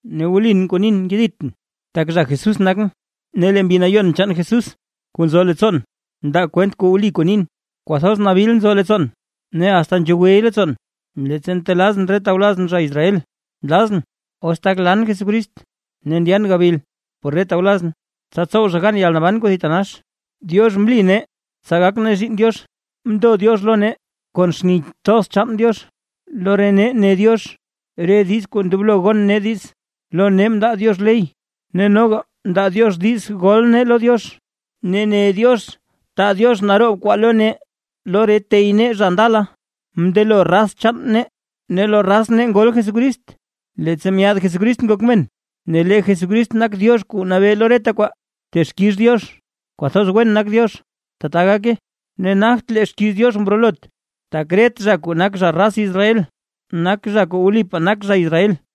Ne wlin kuu nin nkeditʼn tak zha Jesús nakʼn, ne lee Mbi Nayon chaan Jesús kuu nzo leettsoon ndaa kwent wli kuu nin. Kwathoz nabil nzo leettsoon, ne asta nzhogwe leettsoon, leettsa ntelazʼn re tawlazʼn zha Israel. Nlazʼn, os tak lan Jesucrist ne ndyan gabil por re tawlazʼn, tsa tsow zha gan yalnaban kuu thitanax. Diox mli nee tsa gak nee zhiinn Diox, mndo Diox lo nee kon xni thoz chaan Diox, lo re nee ne Diox re diiz kuu ndoblo gon nee diiz, lo nee mndaa Diox ley, ne noga mndaa Diox diiz gol nee lo Diox, ne ne Diox taa Diox naroob kwaa lo nee. Lo re tey nee zha ndala, mndelo raz chaan nee, ne lo raz nee ngol Jesucrist, leettsa myaad Jesucrist ngok men, ne lee Jesucrist nak Diox kuu nabee lo reta kwaa. ¡Texkix Diox, kwathoz wen nak Diox! ¡Tata gake! Ne nagt lee xkiiz Diox mrolot, tak ret zha kuu nak zha raz Israel, nak zha kuu wlipaa nak zha Israel.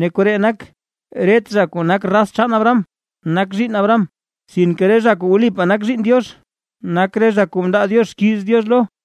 Ne koree nak, ret zha kuu nak raz chaan Abraham nak zhiinn Diox. Sinke re zha kuu wlipaa nak zhiinn Diox, nak re zha kuu mndaa Diox xkiiz Diox lo.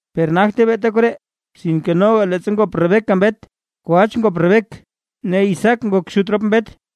Per nagte beeta koree. Sinke noga leettsa ngop Rebeca mbet, kwach ngop Rebeca ne Isaac ngok xut rop mbet.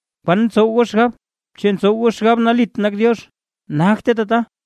¿Kwan ntsow goo xgab? ¿Chu ntsow goo xgab nalit nak Diox? ¡Nagte tata!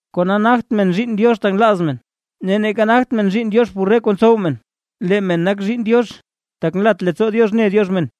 Kona nagt men zhiinn Diox tak nlaaz men, ne neeka nagt men zhiinn Diox por re kuu ntsow men, lee men nak zhiinn Diox tak nlat leettsoo Diox ne Diox men.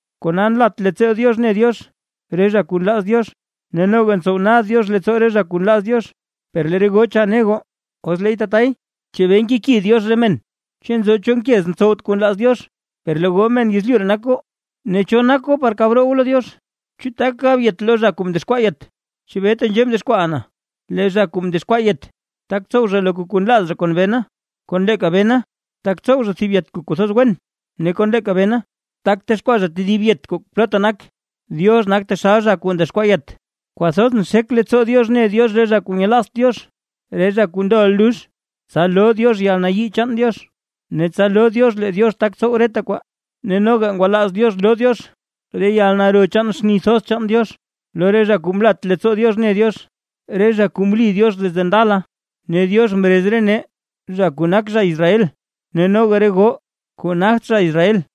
Kona nlat leettsoo Diox ne Diox re zha kuu nlaaz Diox, ne noga ntsow nad Diox leettsoo re zha kuu nlaaz Diox. Per lee re goo cha ne goo: “Os leey tatay, ¿chebee nkeki Diox re men? ¿Chu nzo cho nkez ntsowt kuu nlaaz Diox?” Per lee goo men yezlyu ree nak goo, ne ¿cho nak goo par kab roo goo lo Diox? ¿Chu tak gab yet lo zha kuu mdexkwaa yet? “¿Chebee tenzhee mdexkwaaʼa na?” Lee zha kuu ndexkwaa yet, tak tsow zha loka kuu nlaaz zha kon bena; kon leeka bena, tak tsow zha thib yet chul kuu kwathoz wen, ne kon leeka bena tak texkwaa zha tedib kuu plotta nak. Diox nak taxal zha kuu ndexkwaa yet. Kwathoz nxek leettsoo Diox ne Diox re zha kuu nyelaazt Diox, re zha kuu ndoʼa lux, tsa loo Diox yalnayii chaan Diox, ne tsa loo Diox lee Diox tak tsow reta kwaa. Ne noga ngwalaaz Diox loo Diox re yalnaro chaan xni thoz chaan Diox, lo re zha kuu mlat leettsoo Diox mne Diox, re zha kuu mli Diox desde ndala. Ne Diox mrez re nee, zha kuu nak zha Israel ne noga re goo zha kuu nagt zha Israel.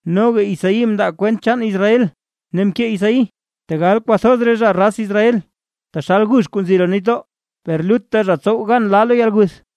Noga Isaí mndaa kwent chaan Israel ne mkee Isaí: “Tegal kwathoz re zha raz Israel taxal gux kuu nzi roo nitdoo, per lutta zha tsow gan laa lo yalguth.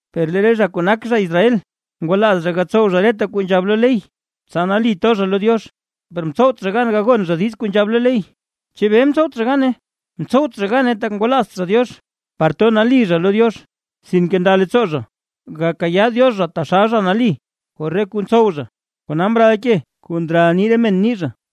Per lee re zha kuu nak zha Israel, ngwalaaz zha gatsow zha reta kuu nzhab lo ley, tsa nali to zha lo Diox, per mtsowt zha gan gagon zha diiz kuu nzhab lo ley. ¿Chebee, mtsowt zha gane? Mtsowt zha gane, tak ngwalaazt zha Diox par nali to zha lo Diox, sinke nda leettsoo zha, gakayaa Diox zha taxal zha nali por re kuu ntsow zha. Kona mral “ke kuu ndral nii re men ni zha”.